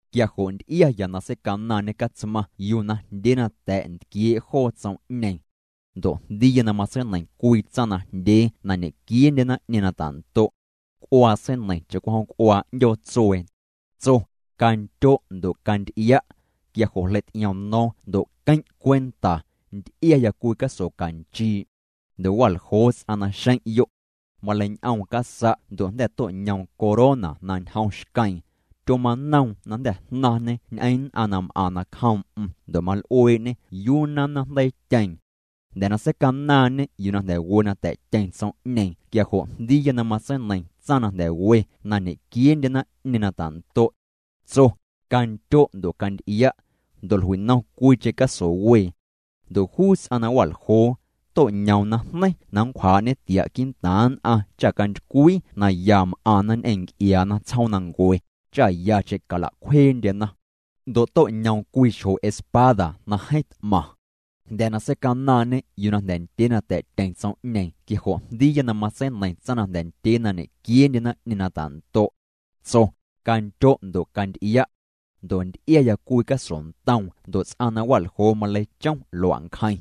Quia jo' nty'iaya nquii Catsmaⁿ seicanaaⁿñê yuu najndyee na ntquiee' joo na ta̱' tsom'ñeeⁿ. Ndo' jndiiya na matseineiⁿ cwii tsaⁿ najndyee na ñequieendye naⁿ'ñeeⁿ na ta'ndo'. C'uaa seineiⁿ cha'cwijom c'uaa 'ndyoo tsuee. Tso: —Candyo' ndo' canty'ia'. Quia jo' jleity'iom no̱o̱ⁿ ndo' queⁿ' cwenta, nty'iaya cwii caso canchii'. Ndo' wa'ljoo ts'aⁿ naxeⁿ'yo'. Maleiñ'oom casa' ndo' jnda̱ to'ñoom corona na ñjom xqueeⁿ. Tyomanoom na jnda̱ jnaⁿñê ñ'eⁿ nn'aⁿ na m'aⁿ nacjoom'm ndo' mal'uee'ñê yuu na nnaⁿjndeiityeeⁿ. Jnda̱ na seicanaaⁿñê yuu na jnda̱ we na ta̱'tyeⁿ tsom'ñeeⁿ quia jo' jndiiya na matseineiⁿ tsaⁿ na jnda̱ we na ñequieendye naⁿ'ñeeⁿ na ta'ndo'. Tso: —Candyo' ndo' canty'ia'. Ndo' jlui'nom cwiicheⁿ caso wee. Ndo' juu ts'aⁿ na wa'ljoo, to'ñoom najneiⁿ na nncwjaa'ñê tia' quii'ntaaⁿ nn'aⁿ cha cantycwii na ya m'aⁿna ñ'eⁿ nc'iaana tsjoomnancue, cha yacheⁿ cala'cwjeendyena. Ndo' to'ñoom cwii xjo espada na jeeⁿ t'maⁿ. Jnda̱ na seicanaaⁿñê yuu na jnda̱ ndyee na ta̱'tyeⁿ tsom'ñeeⁿ quia jo' jndiiya na matseineiⁿ tsaⁿ na jnda̱ ndyee na ñequieendye naⁿ'ñeeⁿ na ta'ndo'. Tso: —Candyo' ndo' canty'ia'. Ndo' nty'iaya cwii caso ntoom ndo' ts'aⁿ na wa'ljoo maleichom lua'ncjeⁿ.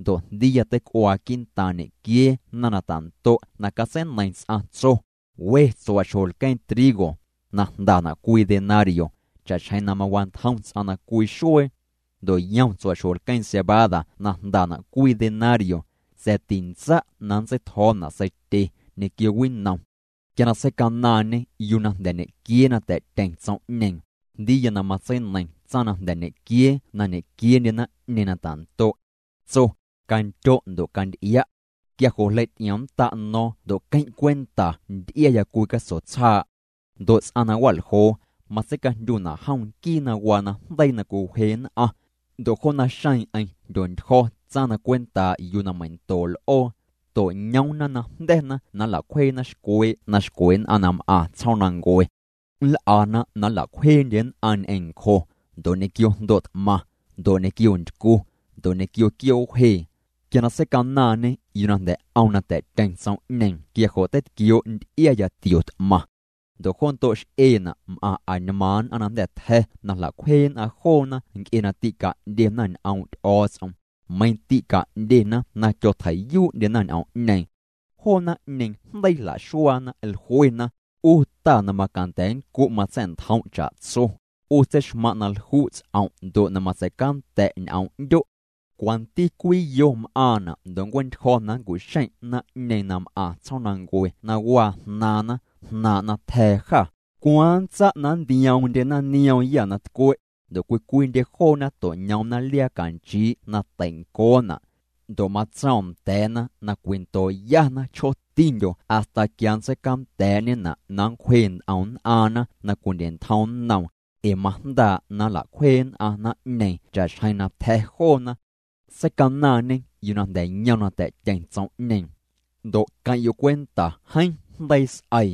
Ndo' jndiiya teic'uaa quii'ntaaⁿ ñequiee naⁿ na ta'ndo' na catseineiⁿ ts'aⁿ, tso: —We tsua'xjo lqueeⁿ trigo, na jndana' cwii denario, cha'xjeⁿ na mawantjom ts'aⁿ na cwii xuee. Ndo' yom tsua'xjo lqueeⁿ cebada na jndana' cwii denario, sa̱a̱ tintsa' na nntseitjo̱o̱na' seitye ñequio winom. Quia na seicanaaⁿñê yuu na jnda̱ ñequiee na ta̱'tyeⁿ tsom'ñeeⁿ, jndiiya na matseineiⁿ tsaⁿ na jnda̱ ñequiee na ñequieendye naⁿ'ñeeⁿ na ta'ndo'. Tso: —Candyo' ndo' canty'ia'. Quia jo' jleity'iomnnda' no̱o̱ⁿ ndo' queⁿ' cwenta nty'iaya cwii caso tsjaa'. Ndo' ts'aⁿ na wa'ljoo, matseicajndyuna' jom nquii na waa najndeii na cwiwje nn'aⁿ. Ndo' jo naxeeⁿ'eⁿ jndyontyjo̱ tsaⁿ na cwentaa' yuu na meindoo' l'oo. To'ñoomna najnda̱na na nla'cwjeena xcwee' na xcwe nn'aⁿ na m'aⁿ tsjoomnancue. Nl'ana na nla'cwjeendye nn'aⁿ ñ'eⁿ ncjo, ndo' ñequio jndo' t'maⁿ, ndo' ñequio ntycu, ndo' ñequio quioo' wjee. Quia na seicanaaⁿñê yuu na jnda̱ 'om na ta̱'tyeⁿ tsom'ñeeⁿ quia jo' teitquioo' nty'iaya tio t'maⁿ. Ndo' jo ndo' x'eena' m'aⁿ añmaaⁿ nn'aⁿ na jnda̱ tja̱ na jla'cwjee nn'aⁿ joona nc'e na tîca'ndyena ñ'oom' Ty'o̱o̱ts'om, meiⁿ tîca'ndyena na tyotjeii'yuu'ndyena ñ'oom'ñeeⁿ. Joo naⁿ'ñeeⁿ jndeii jla'xuaana, jluena: —'U Ta na macanda̱ nncu' matsa̱'ntjom' cha'tso, 'U tseixmaⁿ' na lju' ts'om' ndo' na matsei'canda̱' ñ'oom 'ndyo'. ¿Cwanti cwiyo m'aaⁿna' ndo' nncue'ntyjo̱ na nncu'xeⁿ' naⁿ'ñeeⁿ na m'aⁿ tsjoomnancue na waa jnaaⁿna jnaaⁿ' na tja̱a̱ jâ? ¿Cwaaⁿ nntsa' na nntioomndyena nioomyâ na tcwe'? Ndo' cwii cwiindye joona to'ñoomna liaa canchii' na tei'ncoona'. Ndo' matsoom nda̱a̱na na cwindo'yana chjootindyo hasta quia nntseicanda̱a̱'ñena' na nncwje nt'om nn'aaⁿna na cwindye'ntjom nnoom, ee majndaa' na nla'cwjee nn'aⁿ naⁿ'ñeeⁿ cha'xjeⁿ na tja̱ joona. Seicanaaⁿñê yuu na jnda̱ yom na ta̱'tyeⁿ tsom'ñeeⁿ. Ndo' queⁿ'yo' cwenta jeeⁿ jndeii s'eii.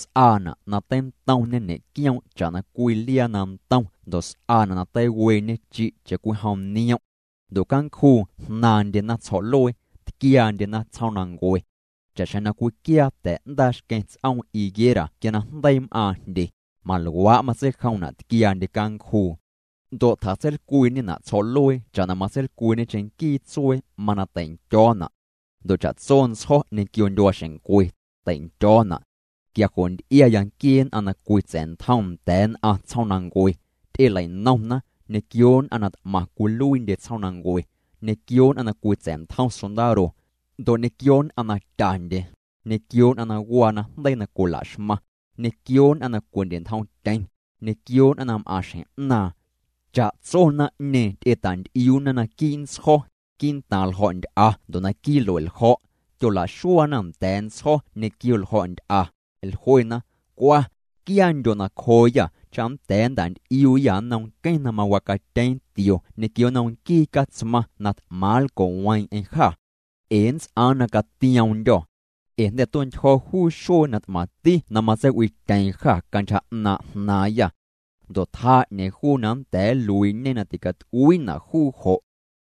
S'aana' na teintomñe ñe'quioom' cha'na cwii liaa na ntom ndo' s'aana' na teiweeñe chi' cha'cwijom niom'. Ndo' cancjuu jnaaⁿndyena tsjo̱'luee, tquiaandyena tsjoomnancue. Cha'xjeⁿ na cwiquiaa ta̱'ndaa xqueⁿ ts'oom higuera quia na jndeii m'aaⁿ jndye, maluaa' matseijomna' tquiaandye cancjuu. Ndo' tjatseilcwiiñena' tsjo̱'luee cha'na matseilcwiiñe cheⁿnquii tsuee mana teindyo̱o̱na'. Ndo' cha'tso ntsjo̱ ñequio ndyuaaxeⁿncwe, tei'ndyo̱o̱na'. Quia jo' nty'iaya nquiee nn'aⁿ na cwitsa̱'ntjom nda̱a̱ nn'aⁿ tsjoomnancue, ty'elei'nomna ñequio nn'aⁿ na t'maⁿ cwiluiindye tsjoomnancue, ñequio nn'aⁿ na cwitsa̱'ntjom sondaro. Ndo' ñequio nn'aⁿ na tyandye, ñequio nn'aⁿ na waa najndeii na cwila'xmaⁿ, ñequio nn'aⁿ na cwindye'ntjomtyeⁿ, ñequio nn'aⁿ na m'aⁿ xjeⁿ 'naaⁿ. Cha'tso naⁿ'ñeeⁿ ty'eta'nty'iuuna naquii' ntsjo̱, quii'ntaaⁿ ljo̱'nty'a ndo' naquii' lue'ljo̱'. Tyola'xuaana nda̱a̱ ntsjo̱ ñequio ljo̱'nty'a, jluena: —Cwa, quiaandyo' nacjooyâ cha nnda̱a̱ nnta'nty'iuuyâ nnom nqueⁿ na mawacatyeeⁿ tio ñequio nnom nquii Catsmaⁿ na t'maⁿ nlco'weeⁿ'eⁿ jâ. Ee nnts'aaⁿ na catio̱o̱ⁿndyô. Ee jnda̱ tue'ntyjo̱ juu xuee na t'maⁿti na matseiw'iityeeⁿ jâ cantyja 'naaⁿ' jnaaⁿyâ. Ndo' tjaa 'ñeeⁿ juu na nnda̱a̱ nluii'ñe na ticat'uiina' juu jo'.